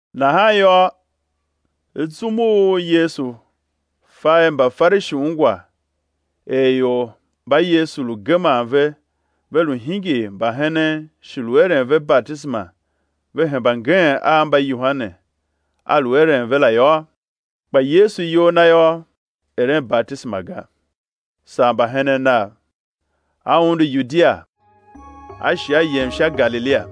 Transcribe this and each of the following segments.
Nahan yô, zum u Yesu fa er Mbafarishi ungwa er ior mba Yesu lu geman ve ve lu hingir mbahenen shi lu eren ve batisema ve hemba ngeen a mba Yohane a lu eren ve la yô, (kpa Yesu iyol Na yô, eren batisema ga, saa mbahenen Nav,) A undu Yudia, a shi A yem sha Galilia.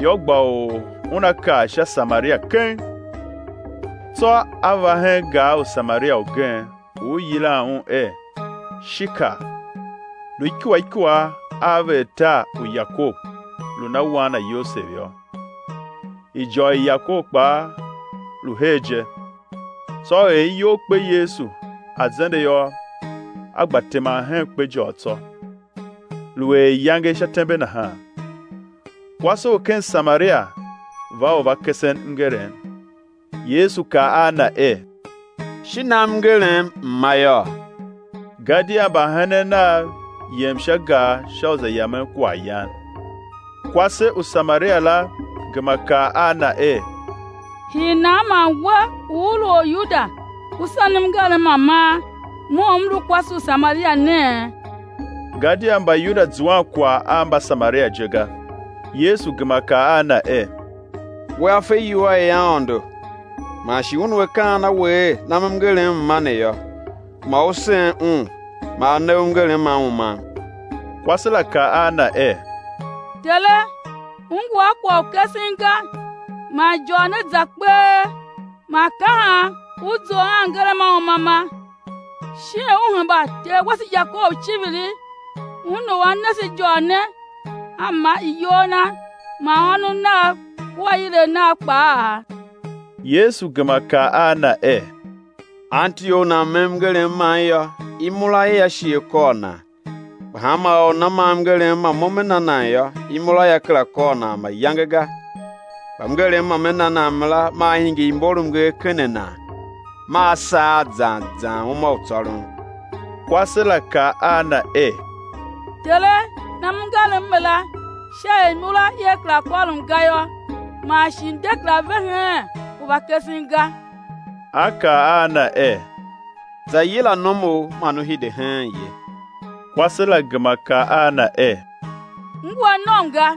Yô, gba u Una kar sha Samaria keng. Tsô A va hen gar u Samaria ugen, u i yilan un er Shikar, lu ikua ikua a veghertar u Yakob lu na wan na Yosev yô; ijôr i Yakob kpaa lu her je. Tsô er iyol kpe Yesu a zende yô, A gba teman hen kpejôr tsô; lu er iyange sha tembe nahan. Kwase u ken Samaria va u va kesen mngerem. Yesu kaa a na er: Shi nam mngerem, M̱ ma yôô. Gadia mbahenen Nav yem sha gar sha u za yamen kwaghyan. Kwase u Samaria la gema kaa a Na er: Hii nan man We u U lu Oryuda U senem mngerem ma man, mo u m lu kwase u Samaria nee? (Gadia Mbayuda zuan kwagh a Mbasamaria je ga.) Yesu gema kaa a na er: Wea fe iwua i Aôndo, man shi Un u A kaan a we er: nam mngerem, M̱ ma, ne yô, ma u sen Un, ma A ne u mngerem ma umam. Kwase la kaa a Na er: Tere, U ngu a kwagh u kesen ga, man ijôr ne za kpee, man ka han U zough a mngerem ma umama? Shin U hemba ter wase Yakob iciviri, un u a na se ijôr ne, a ma i iyol na man ônov nav kua ilev nav kpaa? Yesu gema kaa a na er: Anti or u nan me mngerem man yô, imura ia shi á kôr nan. Kpa hanma or u nana ma mngerem ma Mo Me na nan yô, imura ia kera kôr nan mayange ga; kpa mngerem ma Me na nan mara, maa hingir imbormnger ken a nan, maa saar zan zan uma u tsôron. Kwase la kaa a Na er: Tere, nam mngerem mara, sha er imura ia kera kôrom ga yô, man shi m̱ de kera ve heen u va kesen ga. A kaa a na er: Za yila nomu, man ú hide heen ye. Kwase la gema kaa a Na er: M ngu a nom ga.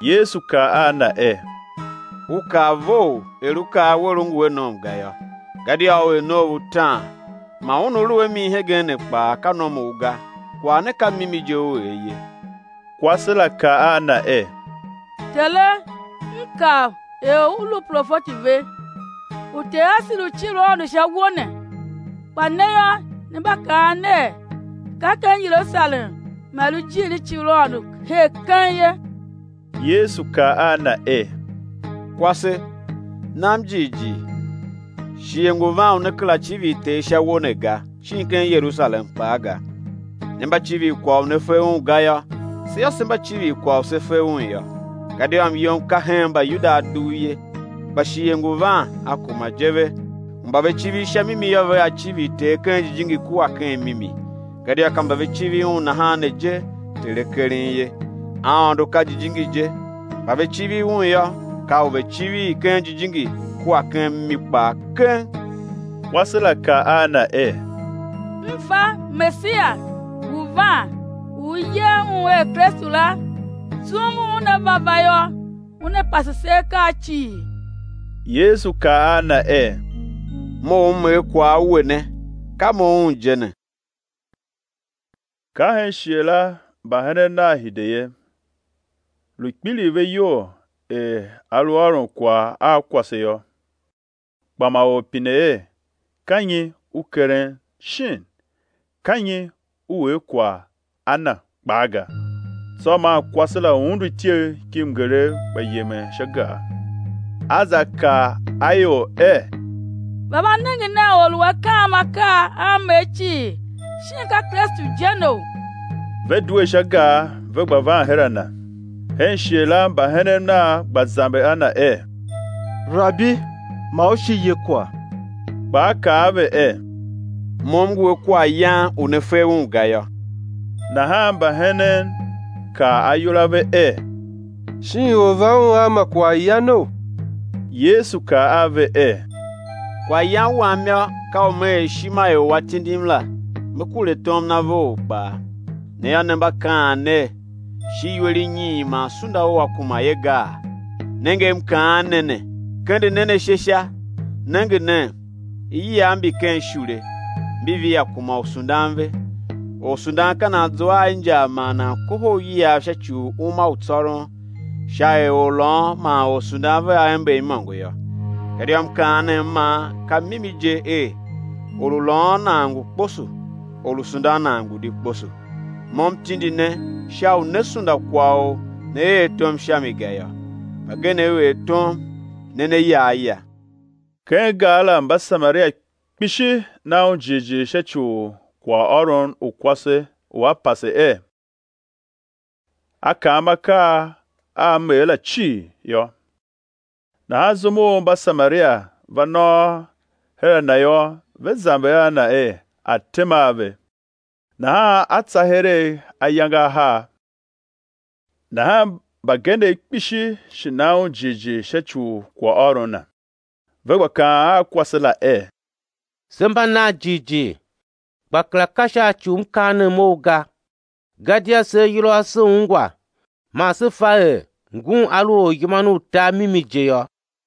Yesu kaa a na er: U kaa vough, er u kaa wer, u ngu a nom ga yô. Gadia u er noov utaan, man un u u lu a mi hegen ne kpaa, ka nomu ga, kwagh ne ka mimi je u er ye. Kwase la kaa a Na er: Tere, m kav er U lu profeti ve. Uter asev lu civir Aôndo sha uwo ne, kpa ne yô, ne mba kaan ner, ka ken Yerusalem man i lu ijiir i civir Aôndo her keng ye. Yesu kaa a na er: Kwase, nam jighjigh, shighe ngu van u né kera civir Ter sha uwo ne ga, shin ken Yerusalem kpaa ga. Ne mba civir kwagh u ne fe un ga yô, se yô; se mba civir kwagh u se fe un yô; gadia myom ka hen Mbayuda a dugh ye. Kpa shighe ngu van, a kuma je ve, u mba ve civir sha mimi yô, vea civir Ter ken jijingi kua ken mimi, gadia ka mba ve civir Un nahan ne je Ter A keren ye. Aôndo ka jijingi je; mba ve civir Un yô, ka u ve̱ civir ken jijingi kua ken mimi kpaa keng. Kwase la kaa a Na er: M fa Mesiya ngu van u i yer Un er Kristu la, zum u Un Una va va yô, Una pase se akaa cii. Yesu kaa a na er: Mo u M er kwagh a we ne, ka Mo Un je ne. Ka hen shighe la mbahenen Nav hide ye, lu kpiligh ve iyol er A lu ôron kwagh a kwase yô, kpa ma or pine er: Ka nyi U keren, shin: Ka nyi U er kwagh a na, kpaa ga. Tsô maa kwase la undu ityegh ki mngeregh gba yemen sha gar, a za kaa a ior er: Va, va nenge nen Or u A kaam akaa a m er cii, shin ka Kristu je neou? Ve due sha gar, ve gba van her a Na. Hen shighe la mbahenen Nav gba zamber a Na er: Rabi, ma U shi ye kwagh. Kpa A kaa a ve er: Mo M ngu a kwaghyan u ne fe un ga yô. Nahan mbahenen kaa ayol a ve er: Shin or va Un a ma kwaghyanou? Yesu kaa a ve er: Kwaghyan Wam yô, ka u Me er ishima i u A tindim la, Me kure tom Na vough kpaa. Ne yô, ne mba kaan ner: Shi iwer inyiin man sunda ua kuma ye gaa? Nenge, M kaan ne ne, kende nen ashe sha, nenge nen, iyiav mbi ken ishule, mbi via kuma u sundan ve. Orsundan ka nan zua a injar man nan kohol iyiav sha ci u uma u tsôron, sha er orlôôn man orsundan vea ember imôngo yô. Gadia mkaanem man ka mimi je er: Or u lôôn nan ngu kposo or u sundan nan ngu di kposo. Mo M tindi ne sha u né sunda kwagh u ne er tom sha mi ga yô; mbagenev er tom, ne ne ya a ya. Ken gar la Mbasamaria kpishi na Un jighjigh sha ci u kwaghôron u kwase u a pase er: A kaam akaa a m er la cii, yô. Nahan zum u Mbasamaria va nôôr her a Na yô, ve zamber a Na er A̱ tema a ve; nahan A tsa heregh ayange ahar. Nahan mbagenev kpishi shi na Un jighjigh sha ci u kwaghôron Na. Ve gba kaan a kwase la er: Se mba nan jighjigh, kpa kera ka sha ci u mkaanem ou ga, gadia se ayol ase se ungwa, man se fa er Ngun A lu Oryiman u tar mimi je yô.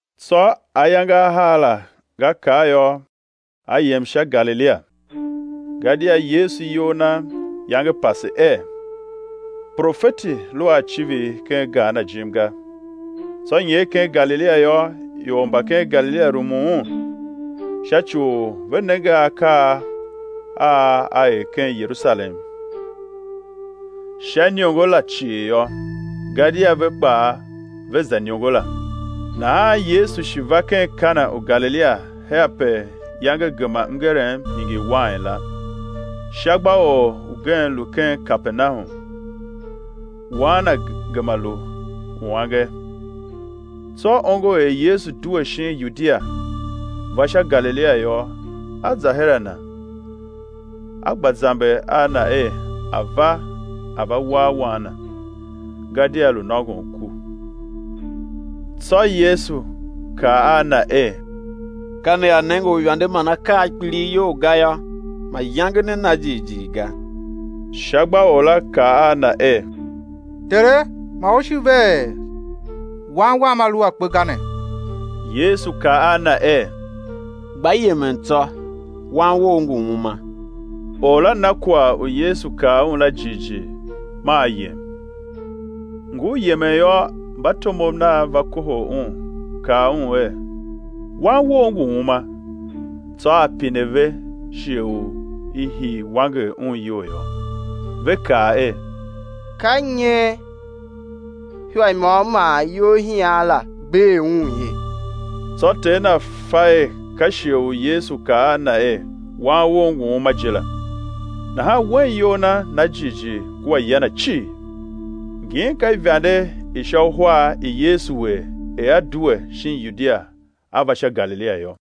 Tsô ayange a ahar la nga kar yô, A yem sha Galilia. Gadia Yesu iyol Na iyange pase er: Profeti lu a icivir ken tar na jim ga. Tsô nyer ken Galilia yô, ior mba ken Galilia rumun Un, sha ci u ve nenge akaa a A er ken Yerusalem sha iniongo la cii yô, gadia ve kpaa ve za iniongo la. Nahan Yesu shi va ken Kana u Galilia her ape iyange gema mngerem hingir wain la. Shagbaor ugen lu ken Kapernahum, wan na gema lu uange. Tsô ongo er Yesu due shin Yudia, va sha Galilia yô, a za her a Na, a gba zamber a Na er A̱ va, A̱ va war wan na, gadia lu nôngon ku. Tsô Yesu kaa a na er: Ka nea nenge uivande man akaa a kpilighyol ga yô, mayange ne na jighjigh ga. Shagbaor la kaa a Na er: Tere, ma U shi ve er wan wam a lu a kpe ga ne. Yesu kaa a na er: Gba yemen tsô, wan wou ngu uma. Or la na kwagh u Yesu kaa un la jighjigh, maa a yem. Ngur yemen yô, mbatomov nav va kohol un, kaa un er: Wan wou ngu uma. Tsô a pine ve shighe u i hii wanger un iyol yô. Ve kaa er: Ka nyen ihwa i môm man iyolhian la bee un ye. Tsô ter na fa er ka shighe u Yesu kaa a na er: Wan wou ngu uma je la. Nahan wen iyol na na jighjigh kua ya na cii. Ngin ka ivande i sha uhar i Yesu er, er A due shin Yudia a va sha Galilia yô.